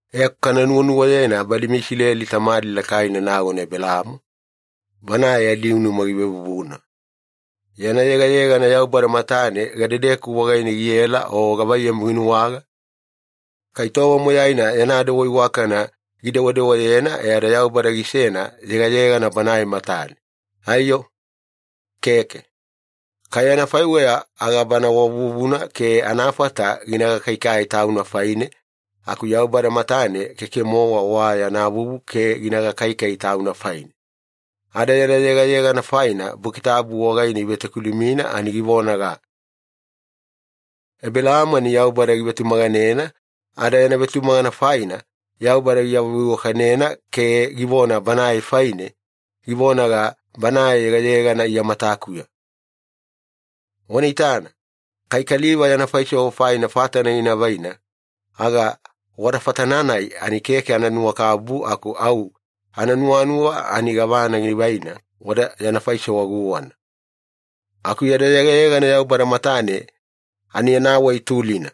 E aku kana nuwanuwayena badi meIsileli tamadi lakaina nagona Ebelaamo, banae adiunuma givevuvuna. Yana yegayegana Yaubada matane, gadedeku wagaine giela o gavaiyamu ginuwaga? Kai tova moyaina yana dewa iwakana gidewadewayena e ada Yaubada gisena yegayegana Banae matane, aiyo? Keke. Kai anafaiweya aga bana wa vuvuna ke anafata gina gakaikai tauna faine, aku Yaubada matane keke-mowa wa yana vuvu ke gina gakaikai tauna faine. Ada yana yegayegana faina, Buki Tabu wagaine ivetokilumina ani givonaga, “Ebelaamo ani Yaubada givetumaganena, ada yana vetumagana faina, Yaubada giawaveiwakanena ke givona banae faine, givonaga, ‘Banae yegayegana Iya matakuya.’” Wana itana, kai kaliva yana faisewa faina fatana gina vaina, aga wada fatana-nai ani keke ananuwakabubu aku au ananuwanuwa ani gavana givaina wada yana faisewa guwana. Aku yada yegayegana Yaubada matane ani anawai tulina.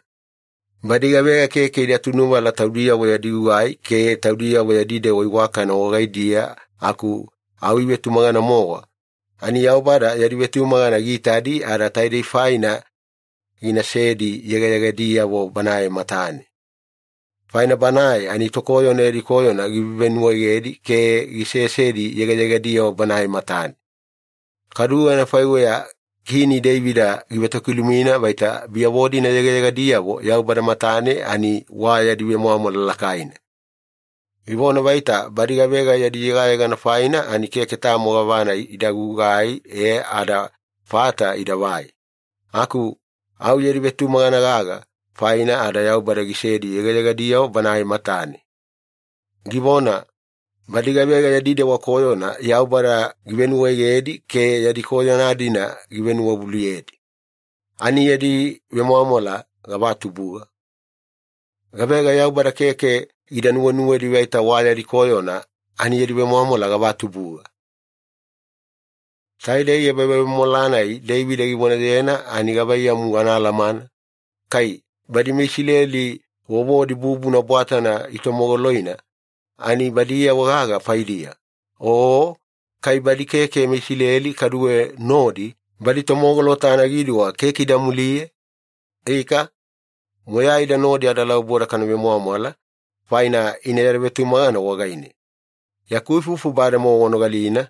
Badi gavega keke ida tunuvala taudiyavo yadi gugai ke taudiyavo yadi dewa iwakana wagaidiya aku au ivetumagana-mowa, ani Yaubada yadi vetumagana giitadi ada taidei faina ginasedi yegayegadiyavo Banae matane. Faina Banae ani tokoyona yadi koyona givevenuwaegedi ke gisesedi yegayegadiyavo Banae matane. Kaduwe anafaiweya Kini Deivida givetokilumina vaita biyavo-dina yegayegadiyavo Yaubada matane ani wa yadi vemwamwala lakaina. Givona vaita badi gavega yadi yegayegana faina ani keke tamo gavana ida gugai e ada fata idavai, aku au yadi vetumagana gaga faina ada Yaubada gisedi yegayegadiyavo Banae matane. Givona, “Badi gavega yadi dewa koyona Yaubada givenuwaegedi ke yadi koyona-dina givenuwavuluyedi ani yadi vemwamwala gavatubuga! Gavega Yaubada keke gida nuwenuwedi vaita wa yadi koyona ani yadi vemwamwala gavatubuga!” Taidei ebavemwamwala-nai Deivida givonayena ani gavaiyamu anaalamana, kai badi meIsileli vovodi bubuna bwatana itomogoloina, ani badiyavo gaga faidiya, o kai badi keke meIsileli kaduwe nodi, badi tomogolota anagiduwa keke ida muliye? Ika, moyaida nodi adalauboda kana vemwamwala, faina ina yada vetumagana wagaine. Yaku ifufu bademowa wanogalina,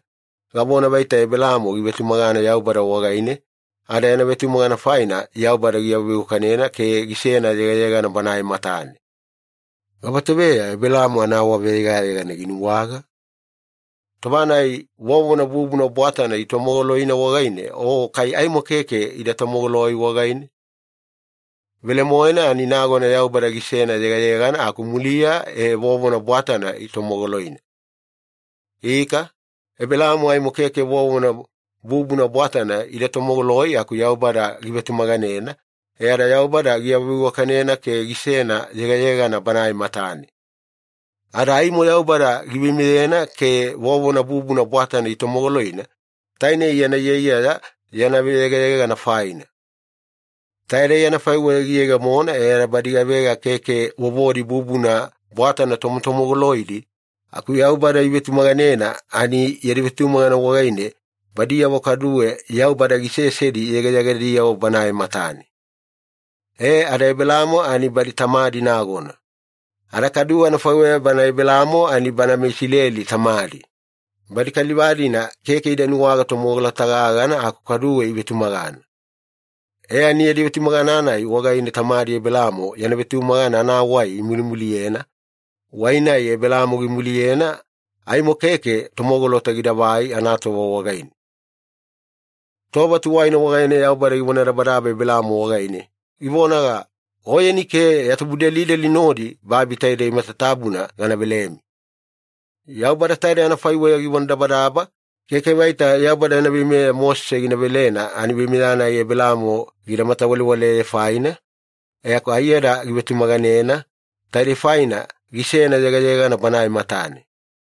gavona vaita Ebelaamo givetumagana Yaubada wagaine, ada yana vetumagana faina Yaubada giawaveiwakanena ke gisena yegayegana Banae matane. Gavatoveya Ebelaamo anaawaveyegayegana ginuwaga? Tova-nai vovona bubuna bwatana itomogoloina wagaine o kai aimo keke ida tomogoloi wagaine? Velemoena ani nagona Yaubada gisena yegayegana aku muliya e vovona bwatana itomogoloina. Ika, Ebelaamo aimo keke vovona bubuna bwatana ida tomogoloi aku Yaubada givetumaganena, e ada Yaubada giawaveiwakanena ke gisena yegayegana Banae matane. Ada aimo Yaubada giveimeyena ke vovona bubuna bwatana itomogoloina, tainei yana iyaiyaya yana veyegayegana faina. Taidei anafaiweya giyegemona e ada badi gavega keke vovodi bubuna bwatana tomotomogoloidi aku Yaubada ivetumaganena, ani yadi vetumagana wagaine badiyavo kaduwe Yaubada gisesedi yegayegadiyavo Banae matane. E ada Ebelaamo ani badi tamadi nagona. Ada kaduwe anafaiweya banae Ebelaamo ani bana meIsileli tamadi, badi kaliva-dina keke ida nuwaga tomogolota gagana aku kaduwe ivetumagana. E ani, yadi vetumagana-nai wagaine tamadi Ebelaamo yana vetumagana anawai imulimuliyena, wai-nai Ebelaamo gimuliyena aimo keke tomogolota gidavai anatova wagaine. Tova tuwaina wagaine Yaubada givonadabadaba Ebelaamo wagaine, givonaga, “Oyeni ke ya tubudelideli nodi babi taidei matatabuna gana velemi.” Yaubada taidei anafaiweya givonadabadaba, keke vaita Yaubada yana veimeya Mosese gina velena ani veimeya-nai Ebelaamo gida matawalewaleye faina, aku aiyada givetumaganena, taidei faina gisena yegayegana Banae matane.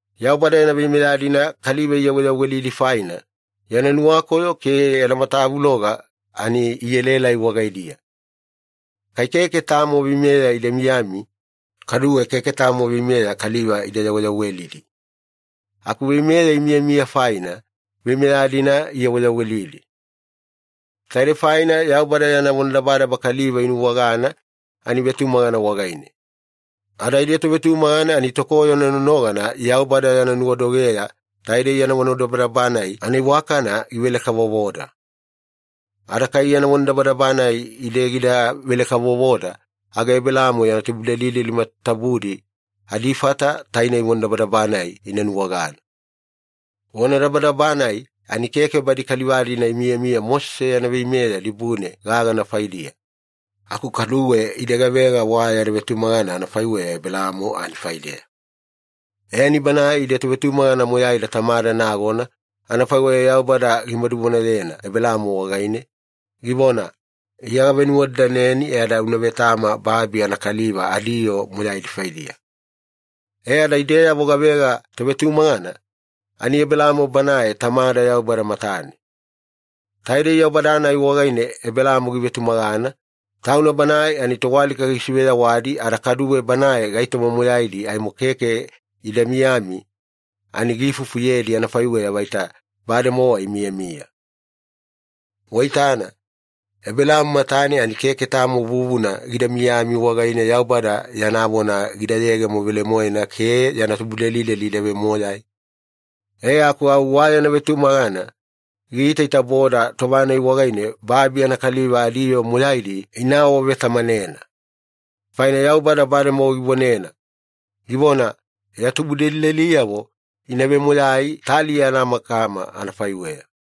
Yaubada yana veimeya-dina kaliva iyaweyawelidi faina, yana nuwakoyo ke yana matavuloga ani ielaelai wagaidiya. Kai keke tamo veimeya ida miyami, kaduwe keke tamo veimeya kaliva ida yaweyawelidi. Aku veimeya imiyamiya faina, veimeya-dina iyaweyawelidi. Taidei faina Yaubada yana vonadabadaba kaliva inuwagana ani vetumagana wagaine. Ada ide tovetumagana ani tokoyona nonogana Yaubada yana nuwadogeya taidei yana vonadabadaba-nai anaiwakana givele-kavovoda. Ada kai yana vonadabadaba-nai ide gidavele-kavovoda, aga Ebelaamo yana tubudelideli matatabudi adifata tainei vonadabadaba-nai ina nuwagana. Vonadabadaba-nai ani keke badi kaliva-dina imiyamiya Mosese yana veimeya dibune gagana faidiya, aku kaduwe ide gavega wa yada vetumagana anafaiweya Ebelaamo ani faideya. E, ani banae ide tovetumagana moyaida tamada nagona, anafaiweya Yaubada gimaduvonayena Ebelaamo wagaine, givona, “Iya gavenuwadadaneni e ada una vetama babi anakaliva adiyoo moyaidi faidiya.” E ada ideyavo gavega tovetumagana, ani Ebelaamo banae tamada Yaubada matane. Taidei Yaubada-nai wagaine Ebelaamo givetumagana, Tauna Banae ani toalika gisiveyawadi ada kaduwe Banae gaitoma moyaidi aimo keke ida miyami ani giifufuyedi anafaiweya vaita bademowa imiyamiya. Waitana, Ebelaamo matane ani keke tamo vuvuna gida miyami wagaine Yaubada yana vona gida yegemo velemoena ke yana tubudelideli ida vemoyai, e aku au wa yana nuwavetumagana giitaitaboda tova-nai wagaine babi anakaliva adiyoo moyaidi ina awavetamanena. Faina Yaubada bademowa givonena, givona, “Ya tubudelideliyavo ina vemoyai taliya anamakama anafaiweya.”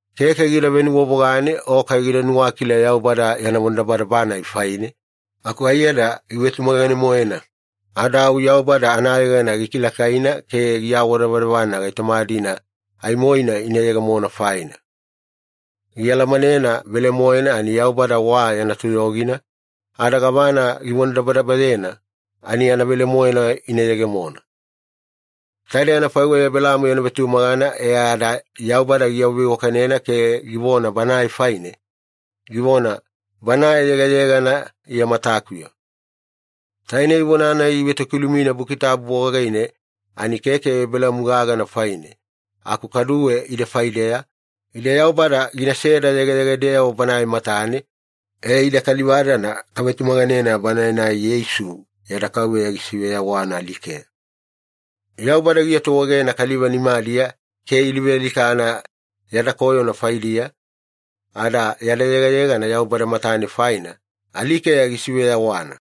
Keke gida venuwavogane o kai gida nuwakila Yaubada yana vonadabadaba-nai faine, aku aiyada givetumagane-moena ada au Yaubada anayegana gikilakaina ke giawadavadavana gaitoma-dina aimoina ina yegemona faina. Gialamanena velemoena ani Yaubada wa yana toyogina, ada gavana givonadabadabayena ani anavelemoena ina yegemona. Taidei anafaiweya Ebelaamo yana vetumagana e ada Yaubada giawaveiwakanena ke givona banae faine, givona, “Banae yegayegana Iya matakuya.” Tainei vona-nai ivetokilumina Buki Tabu wagaine ani keke Ebelaamo gagana faine aku kaduwe ide faideya, ide Yaubada ginaseda yegayegadeyavo Banae matane, e, ide kaliva-dana kavetumaganena Banae-nai Yeisu yada Kauveya gisiveyawana alikeya. Yaubada giatuegena kaliva nimadiya ke iluvealikana yada koyona faidiya, ada yada yegayegana Yaubada matane faina, alikeya gisiveyawana.